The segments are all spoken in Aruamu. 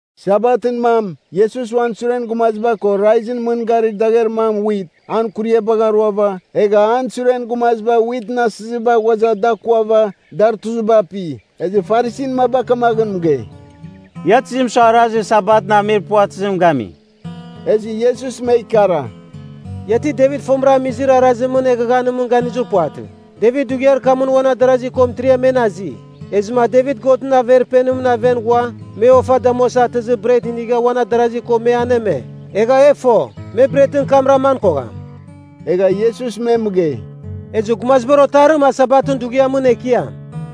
Sabatɨn mam, Iesus uan suren gumaziba ko raizɨn mɨn garir dagher mam wit, an kuriabagh aruava, egha an suren gumaziba witɨn asiziba ghuaza da kuava, dar tuziba api. Ezɨ Farisin maba kamaghɨn mɨgei, “Ia tizim sua arazir Sabatɨn amir puvatɨzim gami.” Ezɨ Iesus me ikara, “Ia ti Devit fomɨra amizir arazimɨn eghaghanimɨn ganizir puvatɨ? Devit dughiar kamɨn uan adarazi ko mɨtiriam men azi, ezɨma Devit Godɨn Averpenimɨn aven ghua me ofa damuasa atɨzir bret inigha uan adarazi ko me aneme. Egha e fo, me bretɨn kam raman kogham.” Egha Iesus me mɨgei, “Ezɨ Gumazibar Otarim a Sabatɨn dughiamɨn Ekiam.”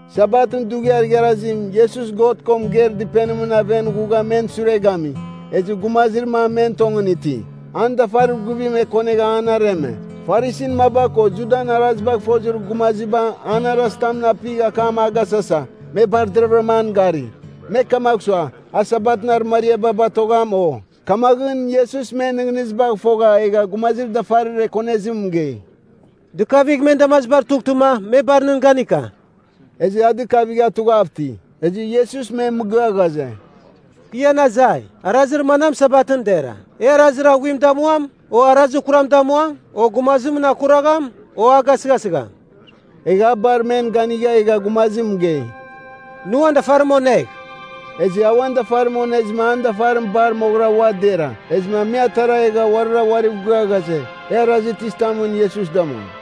Sabatɨn dughiar igharazim Iesus God ko mɨgeir dɨpenimɨn aven ghugha men sure gami, ezɨ gumazir mam men tongɨn iti. An dafarir guvim ekonegha an areme. Farisin maba ko Judan arazibagh fozir gumaziba an arazitamɨn apigh akam agasasa, me bar deravɨra an gari. Me kamagh sua, a Sabatɨn arɨmariaba batogham, o? Kamaghɨn Iesus men nɨghnɨzibagh fogha egha gumazir dafarir ekonezim mɨgei, “Dɨkavigh men damazibar tughtɨma me bar nɨn ganika.” Ezɨ a dɨkavigha tughav iti. Ezɨ Iesus me mɨgɨa ghaze, “Kɨ ian azai, arazir manam Sabatɨn dera? E arazir aghuim damuam, o arazir kuram damuam, o gumazimɨn akuragham, o a gasɨghasɨgham?” Egha a bar men ganigha egha gumazim mɨgei, “Nɨ uan dafarim onegh.” Ezɨ a uan dafarim onezɨma an dafarim bar moghɨra ua dera. Ezɨma me atara egha uarira uariv gɨa ghaze, e arazir tizitamɨn Iesus damuam.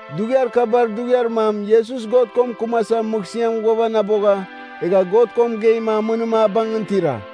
Dughiar kabar dughiar mam Iesus God ko mɨkɨmasa mɨghsɨamɨn mɨn ghuavanabogha, egha God ko mɨgeima amɨnim a bangɨn tira.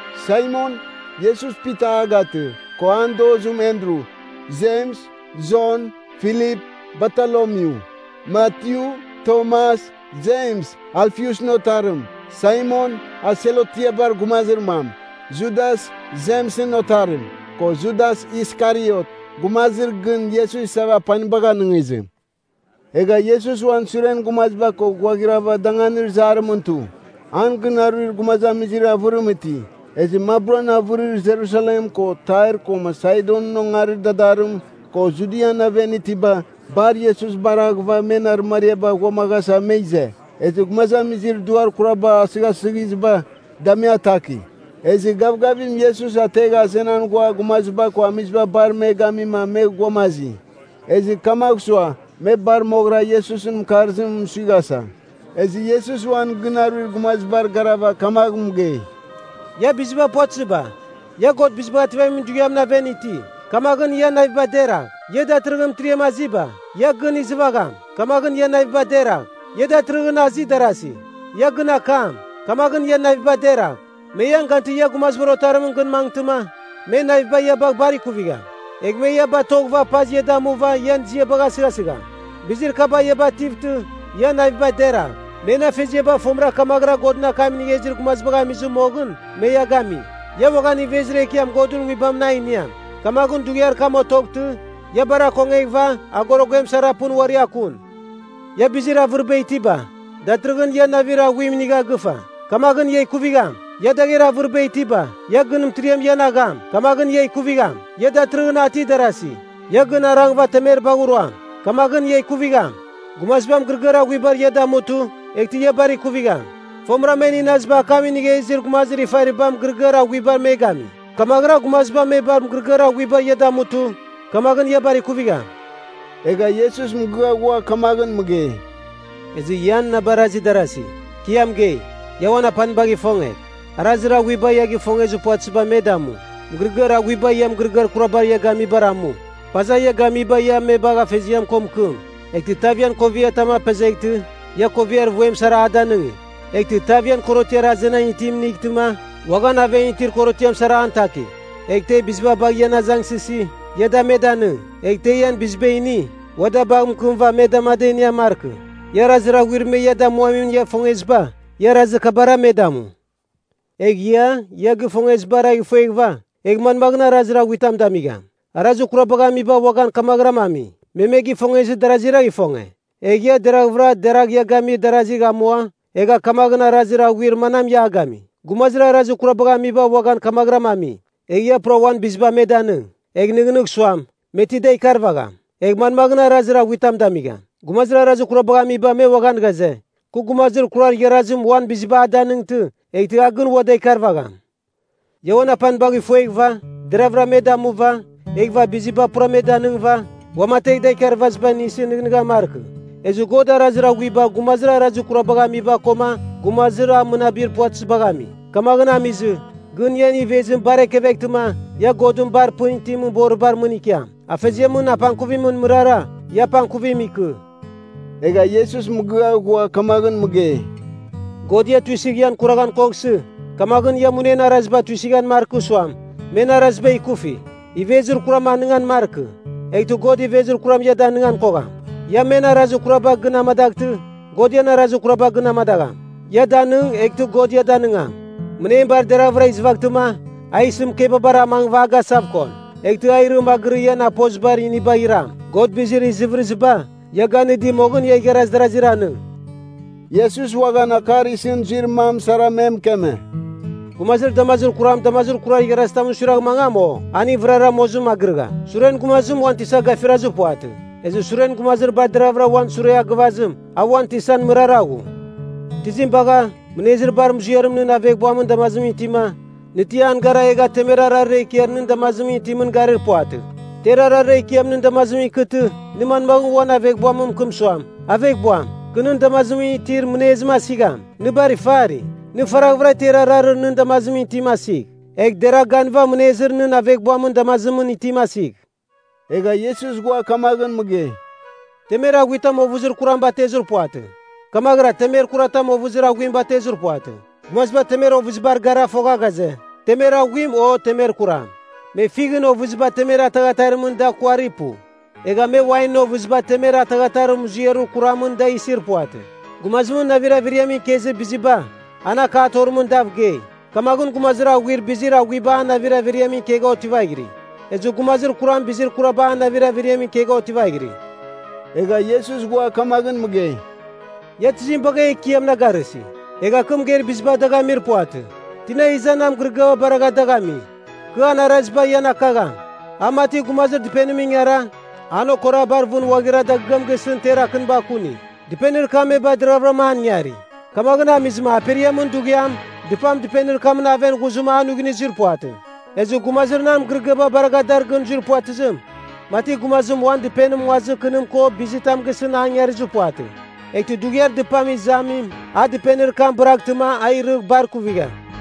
Saimon (Iesus Pita a gatɨ), ko an dozim Andru, Jems, Jon, Filip, Bartolomyu, Matyu, Tomas, Jems Alfiusɨn otarim, Saimon, a Selotiabar gumazir mam, Judas Jemsɨn otarim, ko Judas Iskariot, gumazir gɨn Iesus isava apanibagh anɨngizim. Egha Iesus uan suren gumaziba ko ghuaghirava danganir zarimɨn tu. An gɨn aruir gumazamizir avɨrim iti. Ezɨ maburan avɨrir Jerusalem ko Tair koma Saidonɨn Ongarir dadarim, ko Judian aven itiba, bar Iesus baraghɨva men arɨmariaba ghuamaghasa me ize. Ezɨ gumazamizir duar kuraba asɨghasɨghiziba, da me ataki. Ezɨ gavgavim Iesus ategha azenan ghua gumaziba ko amiziba bar me gami me ghuamazi, ezɨ kamagh sua me bar moghɨra Iesusɨn mɨkarzimɨn suighasa. Ezɨ Iesus uan gɨn aruir gumazibar garava kamagh mɨgei, “Ia biziba puvatɨziba, ia God Bizibagh Ativamin Dughiamɨn aven iti, kamaghɨn ian naviba deragh. Ia datɨrɨghɨn mɨtiriam aziba, ia gɨn izɨvagham, kamaghɨn ian naviba deragh. Ia datɨrɨghɨn azi darasi, ia gɨn akam, kamaghɨn ian naviba deragh. Me ian gantɨ ia Gumazibar Otarimɨn gɨn mangɨtɨma, men naviba ia bagh bar kuvigham. Egh me ia batoghɨva paz ia damuva ian ziabagh asɨghasɨgham. Bizir kaba ia bativtɨ ian naviba deragh. Men afeziaba fomɨra kamaghɨra Godɨn akam inigha izir gumazibagh amizɨ moghɨn me ia gami. Ia uaghan ivezir ekiam Godɨn nguibamɨn a iniam. Kamaghɨn dughiar kam otoghtɨ, ia bar akongeghɨva agoroguem sara pɨn uari akun. Ia bizir avɨriba itiba, datɨrɨghɨn ia navir aghuim inigha gɨfa, kamaghɨn ia ikuvigham. Ia dagher avɨriba itiba, ia gɨn mɨtiriam ian agham, kamaghɨn ia ikuvigham. Ia datɨrɨghɨn ati darasi, ia gɨn arangɨva temeribagh ruam, kamaghɨn ia ikuvigham. Gumaziba mɨgɨrɨgɨar aghuibar ia damutɨ, eghtɨ ia bar kuvigham. Fomɨra men inaziba akam inigha izir gumazir ifariba mɨgɨrɨgɨar aghuiba me gami. Kamaghɨra gumaziba me bar mɨgɨrɨgɨar aghuiba ia damutɨ, kamaghɨn ia bar ikuvigham.” Egha Iesus mɨgɨa ghua kamaghɨn mɨgei, “Ezɨ ian na barazir darasi, kɨ ia mɨgei, ia uan apanibagh ifongegh, arazir aghuiba ia gifongezir puvatɨziba me damu, mɨgɨrɨgɨar aghuiba ia mɨgɨrɨgɨar kuraba ia gamibar amu, paza ia gamiba ia me bagh afeziam ko mɨkɨm. Eghtɨ tav ian koviatam apezeghtɨ, ia koviar vuem sara a danɨngi. Eghtɨ tav ian korotiar azenan itim inightɨma, uaghan aven itir korotiam sara an taki. Egh te biziba bagha ian azangsɨsi, ia da me danɨng. Egh te ian biziba ini, ua da bagh mɨkɨmɨva me dam ada inian markɨ. Ia arazir aghuir me ia damuamin ia ifongeziba, ia arazir kabara me damu. “Egh ia, ia gifongezibara fueghɨva, egh manmaghɨn arazir aghuitam damigham? Arazir kurabagh amiba uaghan kamaghɨram ami. Me me gifongezɨ daraziragh ifonge. Egh ia deraghvɨra deragha ia gamir darazigh amua, egha kamaghɨn arazir aghuir manam ia gami? Gumazir arazir kurabagh amiba uaghan kamaghɨram ami. Egh ia pura uan biziba me danɨng, egh nɨghnɨgh suam, me ti da ikarvagham, egh manmaghɨn arazir aghuitam damigham? Gumazir arazir kurabagh amiba me uaghan ghaze, kɨ gumazir kurar igharazim uan biziba a danɨngtɨ, eghtɨ a gɨn ua da ikarvagham. Ia uan apanibagh ifueghɨva, deravɨra me damuva, eghɨva biziba pura me danɨngɨva, uamategh da ikarvaziba inɨsɨ nɨghnɨghan markɨ. Ezɨ God arazir aghuiba gumazir arazir kurabagh amiba koma gumazir a mɨnabir puvatɨzibagh ami. Kamaghɨn amizɨ, gɨn ian ivezim bar ekeveghtɨma, ia Godɨn bar pɨn itimɨn boribar mɨn ikiam. Afeziamɨn apangkuvimɨn mɨrara, ia apangkuvim ikɨ.” Egha Iesus mɨgɨa ghua kamaghɨn mɨgei, “God ia tuisɨgh ian kuraghan koghsɨ, kamaghɨn ia munen araziba tuisɨghan markɨ suam, men araziba ikufi. Ivezir kuram anɨngan markɨ, eghtɨ God ivezir kuram ia danigan kogham. Ia men arazir kuraba gɨn amadaghtɨ, God ian arazir kuraba gɨn amadagham. Ia danɨng, eghtɨ God ia danɨngam. Mɨnem bar deravɨra izɨvaghtɨma, a isɨ mɨkebabar amangɨva agasavkon, eghtɨ a irɨ magɨrɨ ian apozibar inibagh iram. God bizir izɨvɨrɨziba, ia ganɨdi moghɨn ia igharaz darazir anɨng.” Iesus uaghan akar isɨn zuir mam sara me mɨkeme; “Gumazir damazir kuram damazir kurar igharazitamɨn suiragh mangam, o? Aning vɨrara mozimɨn magɨrɨgham. Suren gumazim, uan tisa gafirazir puvatɨ. Ezɨ suren gumazir bar deravɨra uan sure a gɨvazim, a uan tisan mɨrara ghu. Tizim bagha, mɨnezir bar muziarim nɨn aveghbuamɨn damazimɨn itima, nɨ ti an gara egha temer ararir ekiar nɨn damazimɨn itimɨn garir puvatɨ? Ter ararir ekiam nɨn damazimɨn ikɨtɨ, nɨ manmagh uan aveghbuam mɨkɨm suam, ‘Aveghbuam, kɨ nɨn damazimɨn itir mɨnezim asigham?’ Nɨ bar ifari! Nɨ faraghvɨra ter ararir nɨn damazimɨn itim asigh, egh deragh ganɨva mɨnezir nɨn aveghbuamɨn damazimɨn itim asigh.” Egha Iesus ghua kamaghɨn mɨgei, “Temer aghuitam ovɨzir kuram batezir puvatɨ, kamaghɨra temer kuratam ovɨzir aghuim batezir puvatɨ. Gumaziba temer ovɨzibar gara fogha ghaze, temer aghuim o temer kuram. Me fighɨn ovɨziba temer ataghatarimɨn da kuari pu. Egha me wainɨn ovɨziba temer ataghatarir muziarir kuramɨn da isir puvatɨ. Gumazimɨn navir averiamɨn ikezir biziba, an akatorim, dav gei. Kamaghɨn gumazir aghuim bizir aghuiba an navir averiamɨn ikegha otivaghiri. Ezɨ gumazir kuram bizir kuraba an navir averiamɨn ikegha otivaghiri.” Egha Iesus ghua kamaghɨn mɨgei, “Ia tizim bagha ‘Ekiam’ na garɨsi, egh a kɨ mɨgeir biziba dagh amir puvatɨ? Tina iza nan mɨgɨrɨgɨaba baragha dagh ami, kɨ an araziba ian akagham. A mati gumazim dɨpenimɨn ingara, an okora bar vɨn ghuaghira dagɨam gisɨn ter akɨniba kuni. Dɨpenir kam me bar deravɨram an ingari. Kamaghɨn amizɨma aperiamɨn dughiam dɨpam dɨpenir kamɨn aven ghuzɨma a nuighnuizir puvatɨ. Ezɨ gumazir nan mɨgɨrɨgɨaba baragha dar gɨn zui puvatɨzim, mati gumazim uan dɨpenim nguazir kɨnim ko bizitam gisɨn an ingarizir puvatɨ. Eghtɨ dughiar dɨpam izamim a dɨpenir kam bɨraghtɨma, a irɨgh bar kuvigham.”